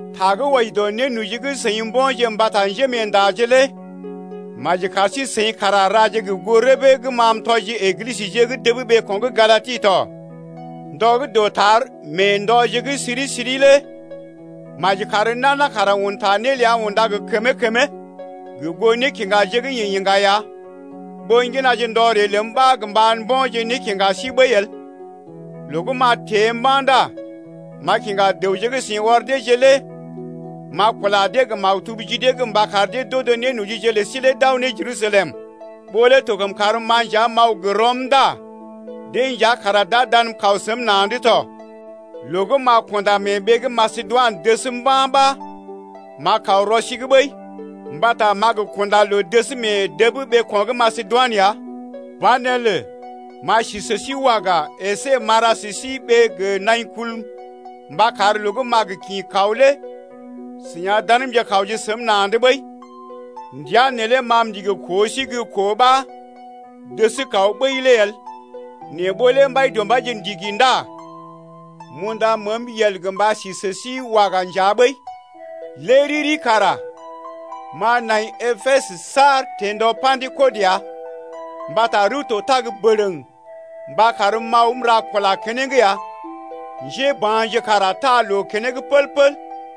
Ta gə́ wɔji dɔ nénoji gə́ seḭ mbo̰je mbata njémeendaje lé maji kar sí-seḭ kara raje gə goo rəbee gə́ ma m’tɔji Eglisəje gə́ dəb ɓeeko̰ gə́ Galati tɔ. Ndɔ gə́ dɔtar mee ndɔje gə́ siri-siri lé maji kar nana kara un ta né ləa unda gə kəmee-kəmee gə goo nékiŋgaje gə́ yeḛ iŋga ya, ɓó ŋginaje ndɔ ree ləm ɓa gə mba mbo̰je nékiŋga sí ɓəi el. Loo gə́ m’a teḛ mba̰ ndá m’a kiŋga dəwje gə́ seḭ ɔr deeje lé m’a kula dee gə maktub ji dee’g mba kar dee d’odo nénojije lə sí lé d’aw ne Jerusalem. Ɓó lé to kəm karm-ma nja m’aw gə rɔm ndá deḛ nja kara d’a danm kaw səm na̰’d tɔ. Loo gə́ m’a kunda mee ɓee gə́ Masedoinə gaŋ mba̰ ɓa m’a kaw rɔ sí’g ɓəi, mbata m’a gə kunda loo dəs mee dəb ɓeeko̰ gə́ Masedoinə ya. Banelə m’a sí sə sí waga əsé m’a ra sə sí ɓee gə naḭ kul mba kar loo gə́ m’a gə kḭ kaw lé seḭ a danmje kawje səm na̰’d ɓəi. Ndəa neelé ma m’ndigi koo sí gə́ koo ɓa dəs kaw ɓəi lé el. Nɛ ɓó lé Mbaidɔmbaije ndigi ndá m’unda məəm yel gə mba si sə sí waga nja ɓəi ya. Lé riri kara m’a nai Epesə saar teḛ ndɔ Pa̰dekɔt ya, mbata rəw to tag bərəŋ mba karm m’aw m’ra kula keneŋ ya, njéba̰je kara taa loo keneŋ pəl-pəl.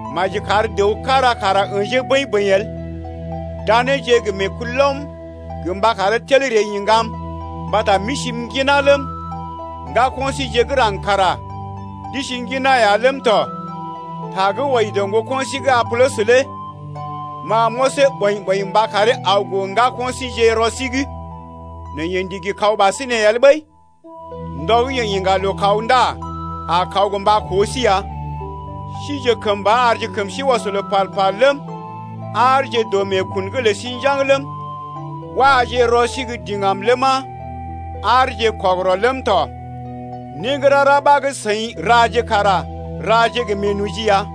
Maji kar dəw kára kara ə̰jee bəḭ-bəḭ el, daneeje gə meekulɔm gə mba karee tel ree iŋgam mbata m’isi m’ŋginá ləm, ŋgako̰ síje gə́ raŋg kara d’isi ŋginá ya ləm tɔ. Ta gə́ wɔji dɔ ŋgoko̰ sí gə́ Apolɔs lé ma m’ɔsee ɓɔḭ-ɓɔḭ mba karee aw gə ŋgako̰ síjeḛ rɔ sí’g, nɛ yeḛ ndigi kaw ɓasinè el ɓəi. Ndɔ gə́ yeḛ iŋga loo kaw ndá a kaw gə mba koo sí ya. Sije kəmba arje kəm sí ɔs loo pal-pal ləm, aarje dɔ meekun’g lə sí njaŋg ləm, waje rɔ gə́ diŋgam ləma, aarje kɔgərɔ ləm tɔ. Né gə́ rara ɓa gə́ seḭ raje kara raje gə meenoji ya.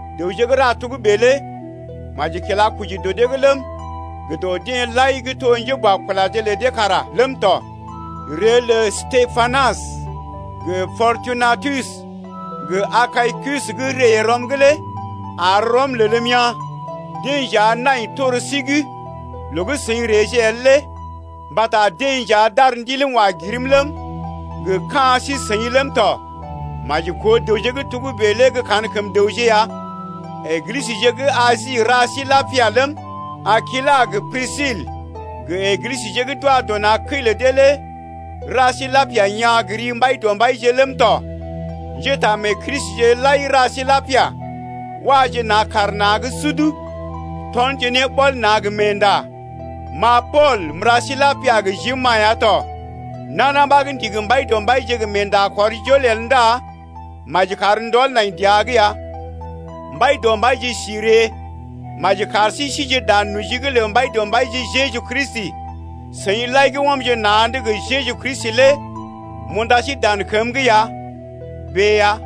Dəwje gə́ ra togə́bè lé maji kila koji dɔ dee’g ləm, gə dɔ deḛ lai gə́ to njéboakulaje lə dee kara ləm tɔ. Ree lə Stepanas gə Pɔrtunatus gə Akaikus gə́ ree rɔm’g lé ar rɔm lelm yaa̰, deḛ nja nai tor sí’g loo gə́ seḭ reeje el lé, mbata deḛ nja d’ar ndiləm wa girm ləm, gə ka̰ sí-seḭ ləm tɔ. Maji koo dəwje gə́ togə́bè lé gə́ kankəm dəwje ya. Eglisəje gə́ Asi ra sí lapia ləm, Akilas gə Prisil gə Eglisə gə́ d’wa dɔ na̰ kəi lə dee lé ra sí lapia yaa̰ gə ri Mbaidɔmbaije ləm tɔ. Njétaamee-Kristije lai ra sí lapia. Waje na̰ kaar na̰’g sud tɔnje ne ɓɔl na̰ gə meenda. Ma Pool m’ra sí lapia gə jim-ma ya tɔ. Nana ɓa gə́ ndigi Mbaidɔmbaije gə meekɔr jol-jol el ndá maji kar ndɔl nai dəa’g ya. Mbaidɔmbaije si ree! Maji kar sí síje dan noji’g lə Mbaidɔmbaije Jeju Kristi! Seḭ lai gə́ ɔmje na̰’d gə Jeju Kristi lé m’unda sí dan kəm’g ya. Bèe ya!